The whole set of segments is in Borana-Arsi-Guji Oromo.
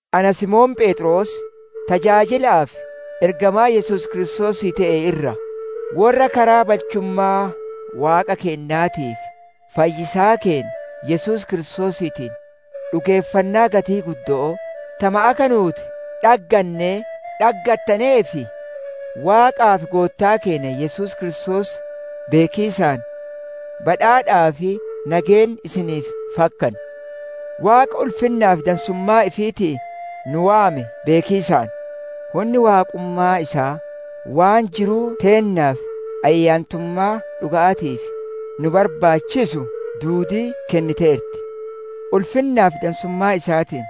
Ana Simoon Pheexroosii, tajaajila'aa fi ergamaa Yesuus Kiristoosii te'e irraa: Worra karaa balchummaa Waaqa keennaatii fi fayyisaa keenna Yesuus Kiristoosiitiin, dhugeeffannaa gatii guddo'oo, tama akka nuuti dhaggannee dhaggattaneef: Waaqaa fi Goottaa Keenna Yesuus Kiristoos beekiisaan, badhaadhaa fi nageenni isiniif fakkanu. Waaqa ulfinnaa fi dansummaa ifiitiin nu waame beekiisaan, hunni Waaqummaa isaa, waan jiruu teennaa fi ayyaantummaa dhuga'aatiif nuu barbaachisu duudii kenniteerti. Ulfinnaa fi dansummaa isaatiin,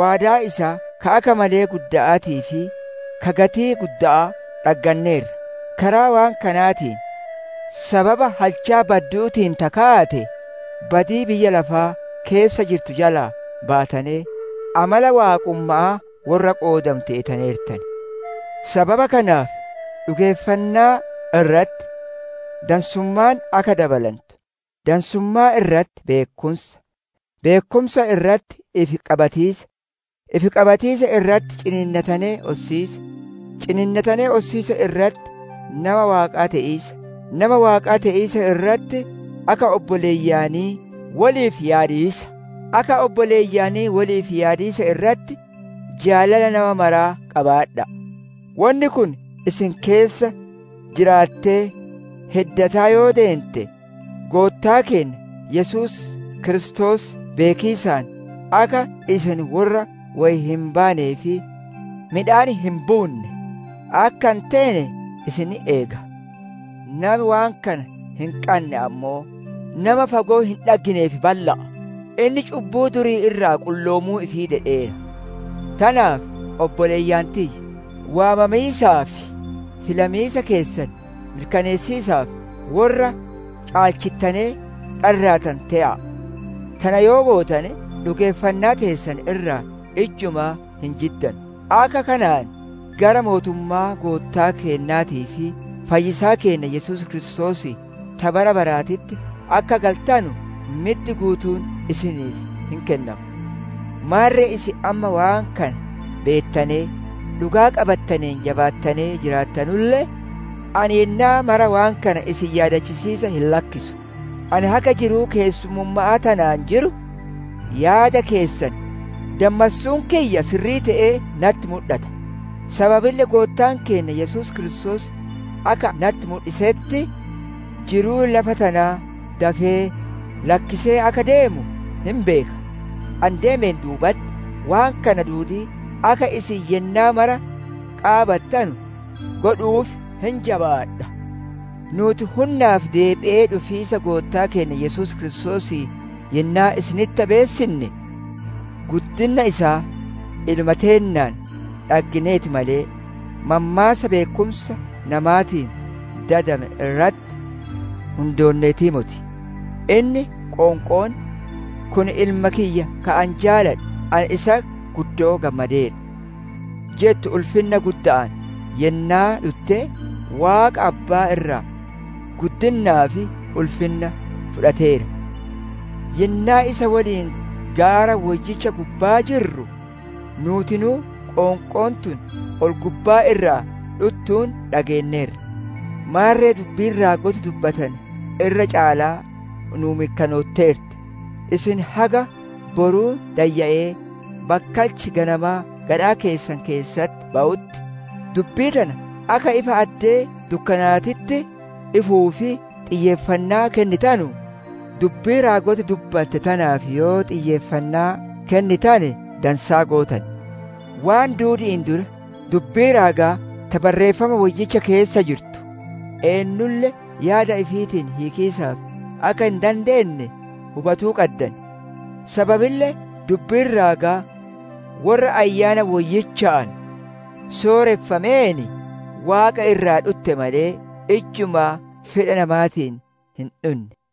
waadaa isaa ka akka malee gudda'aatii fi ka gatii gudda'aa dhagganneerra; karaa waan kanaatiin, sababa halchaa baddu'uutiin ta kaate, badii biyya lafaa keessa jirtu jalaa baatanee, amala Waaqumma'aa worra qoodamu teetaneertan. Sababa kanaaf, dhugeeffannaa irratti dansummaan akka dabalantu, dansummaa irratti beekkumsa, beekkumsa irratti ifi qabatiisa, ifi qabatiisa irratti ciniinnatanee ossiisa, ciniinnatanee ossiisa irratti nama Waaqaa te'iisa, nama Waaqaa te'iisa irratti, akka obboleeyyanii woliif yaadiisa, akka obboleeyyanii woliif yaadiisa irratti jaalala nama maraa qabaadha'a. Wonni kun isin keessa jiraattee heddataa yoo deente, Goottaa keenna Yesuus Kiristoos beekiisaan, akka isin worra woy hin baanee fi midhaan hin buunne akka hin teene isin hin eega. Nami waan kana hin qanne ammoo, nama fagoo hin dhagginee fi balla'a; inni cubbuu durii irraa qulloomuu ifii dedheera. Tanaaf obboleeyyan tiyya! Waamamiisaa fi filamiisa keessan mirkaneessiisaaf, worra caalchittanee dharraatanu te'a'a; tana yoo gootane dhugeeffannaa teessan irraa ijjumaa hin jiddanu. Akka kanaan, gara mootummaa Goottaa keennaatii fi fayyisaa keenna Yesuus Kiristoosii, ta bara baraatitti akka galtanu middi guutuun isiniif hin kennama. Maarre isin amma waan kana beettanee, dhugaa qabattaneen jabaattanee jiraattanulle, ani yennaa maraa waan kana isin yaadachisiisa hin lakkisu. Ani haga jiruu keessummumma'aa tanaan jiru, yaada keessan dammassuun kiyya sirrii te'ee natti mudhata. Sababille Goottaan keenna Yesuus Kiristoos akka natti mudhisetti jiruu lafa tanaa dafee lakkisee akka deemu hin beeka. Ani deemeen duubale'etti, waan kana duudii akka isin yennaa mara qaabattanu godhu'uuf hin jabaadha. Nuuti hunnaa fi deebi'ee dhufiisa Goottaa keenna Yesuus Kiristoosii yennaa isinitti beessinne, guddinna isaa iluma teennaan dhaggineeti malee, mammaassa beekkumsa namaatiin dadame irratti hundoonneetii moti. Inni qoonqoon, «Kun Ilma kiyya ka ani jaaladhu, ani isatti guddoo gammadeera» jettu ulfinna gudda'aan yennaa dhutte, Waaqa Abbaa irraa guddinnaa fi ulfinna fudhateera. Yennaa isa woliin gaara woyyicha gubbaa jirru, nuutinuu qoonqoon tun ol-gubbaa irraa dhuttuun dhageenneerra. Maarre dubbiin raagoti dubbatane irra caalaa nuu mirkanootteerti. Isin haga boruun dayya'ee bakkalchi ganamaa gadhaa keessan keessatti bawutti, dubbii tana akka ifa addee dukkanaatitti ifuuf xiyyeeffannaa kennitanu, dubbii raagoti dubbatte tanaaf yoo xiyyeeffannaa kennitane dansaa gootan. Waan duudi'iin dura, dubbii raagaa ta Barreeffama Woyyicha keessa jirtu, eennulle yaada ifiitiin hiikiisaaf akka hin dandeenne hubatuu qaddan. Sababille dubbiin raagaa worra Ayyaana Woyyichaan sooreffameen Waaqa irraa dhutte malee, ijjumaa fedha namaatiin hin dhunne.